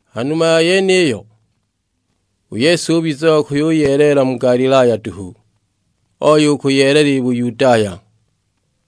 Ha numa ya yeniyo, u Yesu ubiza wa kuyuyeelela mu Galilaya duhu, oya u kuyeelela i Buyudaya;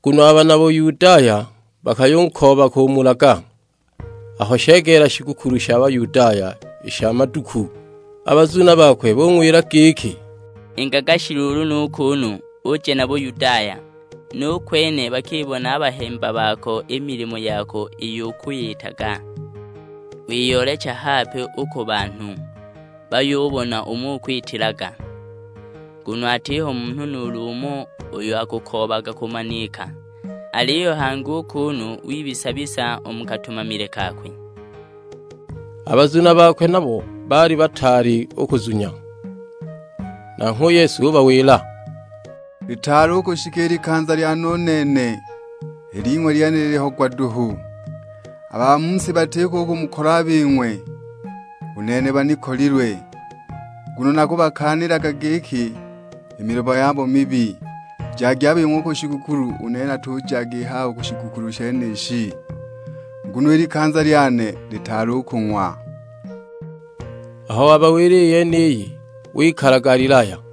nguno a bana Buyudaya bakayukooba kumulaga. Aho shegeela shigukulu sha Bayudaya i sha Maduku, a bazuna bakwe bung'wila giki, "Ingaga shi luulu nu kuunu, uje na Buyudaya; nu kwene bakibone a bahemba bako i milimo yako iyo ukwiyitaga! Wiyoolecha hape u ku banhu bayubona umo ukwitilaga; nguno atiho munhu nuulu umo uyo akakoobaga kumanika, aliyo hangi u kunu wibisa-bisa u mu katumamile kakwe!" A bazuna bakwe nabo baali bataali u kunzunya. Nanghwe u Yesu ubawila, "Litaali u kushika i likanza lyane u nene, i ling'we i lyene liliho gwa duhu. A ba mu si batiko u kumukolwa a bing'we, u nene banikolilwe, nguno nakubakaanilaga giki i milimo yabo mibi. Jagi a bing'we u ku shigukulu, u nene natujaga i haha u ku shigukulu shenishi, nguno i likanza lyane litaali u kung'wa." Aho wabawila i yeniyi wikala Galilaya.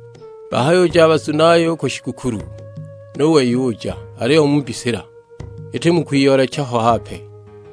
Bahayuja a bazunaye u ku shigukulu, nu wei uja, aliyo mu mbisila, iti mu kwiyoolecha bo hape.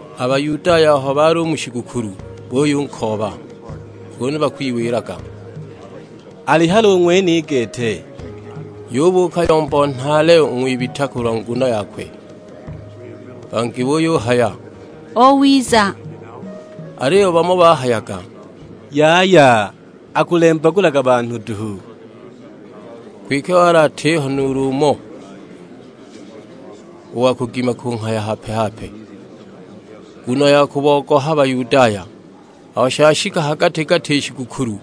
A Bayudaya aho bali u mu shigukulu buyunkooba, kunu bakwiwilaga, "Ali hali u ng'wene i gete?" Yubuuka yombo nhaale u ng'wibita kulwa nguno yakwe; bangi buyuhaya, "Owiza;" aliyo bamo bahayaga, "Yaya, akulembagulaga banhu duhu!" Kwike wali atiho nuulu umo, u wa kugima kunghaya hape-hape, nguno ya kubogoha Bayudaya. Aho shashika ha gati-gati i shigukulu,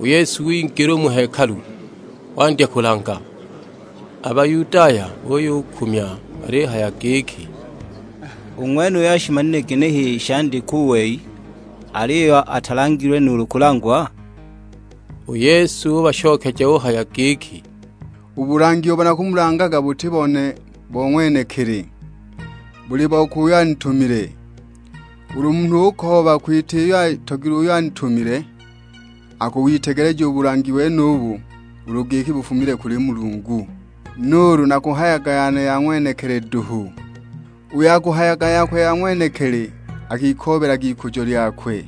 u Yesu wingila u mu hekalu, wandya kulanga. A Bayudaya buyukumya balihaya giki, "U ng'wenuyu ashimanile ginehe i shandikwa u wei, aliyo atalangilwe nuulu kulangwa?" U Yesu ubashokeja uhaya giki, "U bulangi ubo nakulangaga buti bone bo ng'wenekili, buli bokwe uyo anitumile. Ulu munhu ukooba kwita iyo ayitogilwe uyo anitumile, akuwitegeleja u bulangi wenubu ulu giki bufumile kuli Mulungu, nuulu nakuhayaga yane ya ng'wenekili duhu. Uyo akahayaga yakwe ya ng'wenekili, akikoobelaga ikujo lyakwe.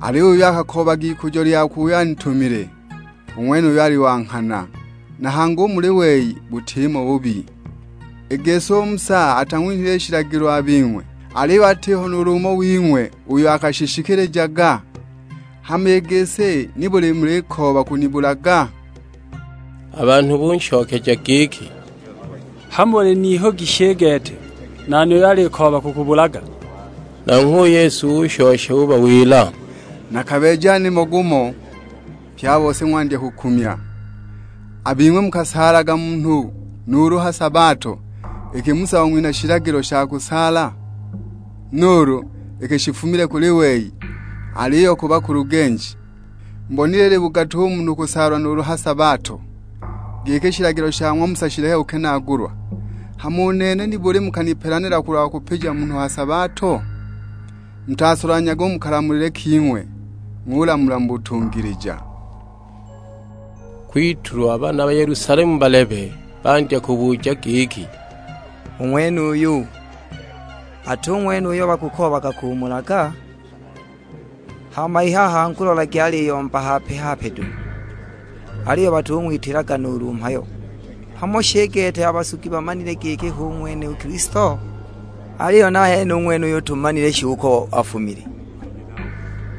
Aliyo uyo akakoobaga ikujo lyakwe uyo antumile, u ng'wenuyo ali wa nghana, na hangi u muli wei butimo bubi. I gisi u Musa atang'winhile shilagilo a bing'we, aliyo atiho nuulu umo wing'we uyo akashishikilijaga? Hama i gisi nibuli mulikooba kunibulaga?" A banhu bunshokeja giki, "Hamo uli n'ihugi shi i gete, nani uyo alikooba kukubulaga?" Nanghwe u Yesu ushosha ubawila, "Nakabeeja nimo gumo, pye a bose ng'wandya kukumya! A bing'we mukasaalaga munhu nuulu ha sabato, iki Musa wang'winha shilagilo sha kusaala, (nuulu iki shitafumile kuli wei, aliyo ku bakulugenji). Mubonile ili bugatu u munhu u kusaalwa nuulu ha sabato, giki shilagilo sha ng'wa Musa shileke kukenaagulwa, hama u nene nibuli mukanipelanila kulwa kupija munhu ha sabato? Mutasolanhyage u mu kalamulile king'we, ng'ulamula mu butungilija." Kwitulwa bana Yelusalemu balebe bandya kubuja giki, "U ng'wenuyu, ati ng'wene uyo bakukoobaga kumulaga? Hama i haha angu lolagi aliyomba hape-hape duhu, aliyo batung'witilaga nuulu mhayo, hamo shi i gete a basugi bamanile giki hu ng'wene u Kilisto? Aliyo nahene u ng'wenuyu tumanile shi uko afumile,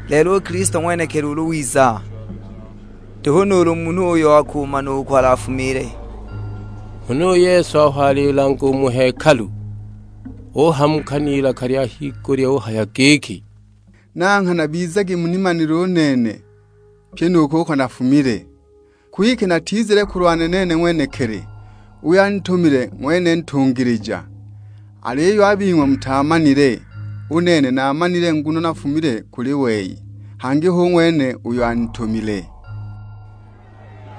lelo u Kilisto ng'wenekili ulu wiza, nduhu nuulu munhu umo uyo akumana uko alafumiile!" Huna u Yesu aho alilanga u mu hekalu, uhamuka n'ilaka lya higulya uhaya giki, "Na nghana bizagi munimanile u nene, pyi nu kuko nafumile. Kwike natizile kulwane nene ng'wenekili, uyo anitumile ng'wene ntungilija; aliyo a bing'we mutaamanile! U nene naamanile nguno nafumile kuli wei, hangi hu ng'wene uyo anitumile."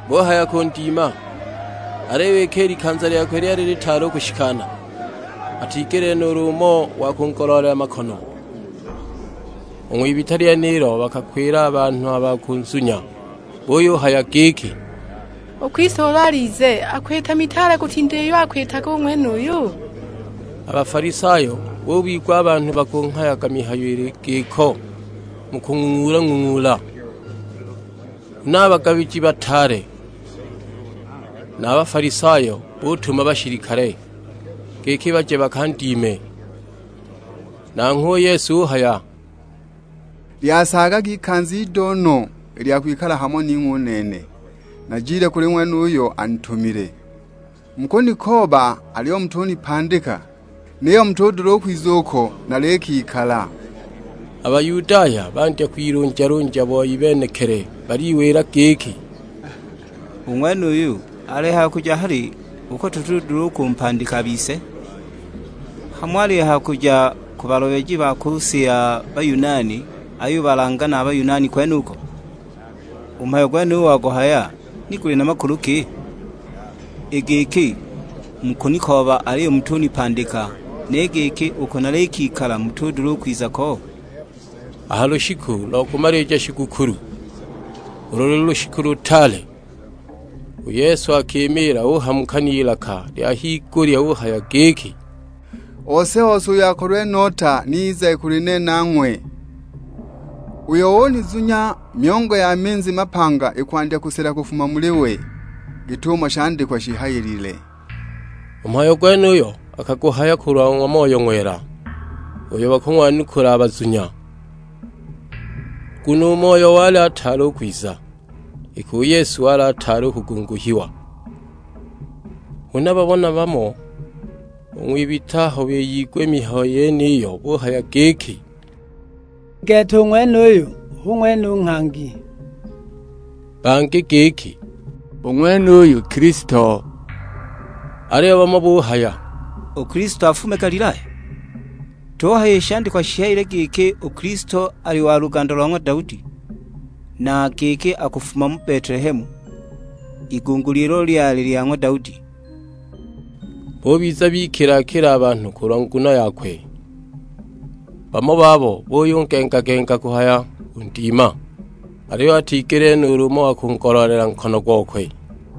Buhaya kundima, aliyo iki i likanza lyakwe lyali litaali u kushikana, atigelile nuulu umo wa kungoloolela makono. U ng'wibita lyenilo bakakwila a banhu ba kunzunya, buyuhaya giki, "U Kilisto ulu alize, akwita mitaale kutinda iyo akwitaga u ng'wenuyu?" A Bafalisayo bubigwa a banhu bakunghayaga mihayo ili giko mu kung'ung'uula-ng'ung'uula. Huna a bagabiji bataale na a Bafalisayo butuma bashilikale, giki baje bakandime. Nanghwe u Yesu uhaya, "Lyasaagaga ikanza ido no i lya kwikala hamo ning'we u nene; najile kuli we uyo anitumile. Mukunikooba aliyo mutunipandika, niyo mutudula u kwiza uko nalikikala." A Bayudaya bandya kwilunjalunja boi benekili baliwila giki, "U ng'wenuyu, alihaya kuja hali uko dutudula u kumpandika a bise? Hamo alihaya kuja ku balobeji ba ku si ja Bayunani ayubalanga na Bayunani kwenuko! U mhayo gwenuyu waguhaya, ni guli na makulu ki? 'I giki, Mukunikooba aliyo mutunipandika,' ni giki, 'Uko nalikikala mutudula u kwiza ko?' " A ha lushiku lo kumalija shigukulu, ulo luli lushiku lutaale, u Yesu akimiila uhamuka n'ilaka lya higulya uhaya giki, "Ose-ose uyo akolilwe nota ni izage kuli nene ang'we. Uyo unizunya, myongo ya minzi mapanga ikwandya kusela kufuma muli we, git'umo shandikwa shihayilile." U mhayo gwenuyo akaguhaya kulwa ng'wa Moyo Ng'wela, uyo bakung'wanukula a bazunya; nguno u Moyo wali ataali u kwiza, iki u Yesu wali ataali u kugunguhiwa. Huna bamo na bamo u ng'wibita aho biyigwa i mihayo yeniyo, buhaya giki, "I gete u ng'wenuyu hu ng'wene u Nghangi!" Bangi giki, "U ng'wenuyu Kilisto!" Aliyo bamo buhaya, "U Kilisto afume Galilaya? Tuhaya i shandikwa shihayile giki u Kilisto ali wa luganda lo ng'wa Daudi, na giki akufuma Betelehemu, igunguli ilo lyali lya ng'wa Daudi?" Bubiza bikila-kila a banhu kulwa nguno yakwe. Bamo babo buyugengagenga kuhaya kundima, aliyo atigelile nuulu umo wa kungoloolela nkono gokwe.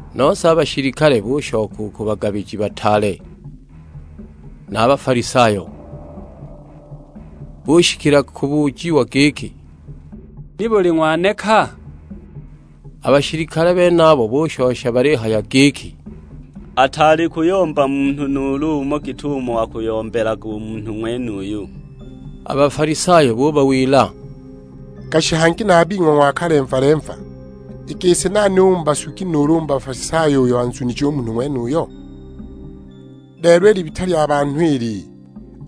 Nose a bashilikale bushoka u ku bagabiji bataale na a Bafalisayo, bushikila kubujiwa giki, "Nibuli ng'waneka?" A bashilikale benabo bushosha balihaya giki, "Ataali kuyomba munhu nuulu umo git'umo akuyombelaga u munhu ng'wenuyu!" A Bafalisayo bubawila, "Gashi hangi na a bing'we ng'wakalemva-lemva! I gisi nani u mu basugi, nuulu u mu Bafalisayo uyo anzunije u munhu ng'wenuyo? Lelo i libita lya banhu ili,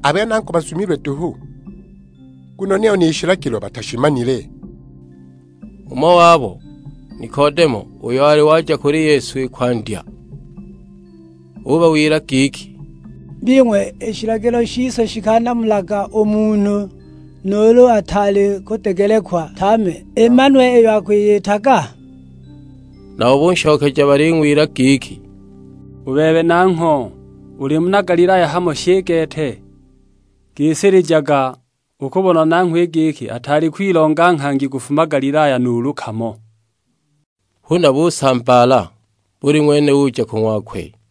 a bene angu bazumilwe duhu; nguno niyo ni shilagilo batashimanile!" Umo wabo, Nikodemo: uyo wali waja kuli Yesu i kwandya, ubawila giki, "Bing'we, i shilagilo shise shikanamulaga u munhu nuulu ataali kudegelekwa tame, imanwe iyo akuyitaga?" Nabo bunshokeja baling'wila giki, "U bebe nangho, uli muna Galilaya hamo shi i gete? Gisilijaga, ukubona nangho i giki ataali kwilonga nghangi kufuma Galilaya nuulu kamo!" [ Huna busambaala, buli ng'wene uja ku ng'wakwe.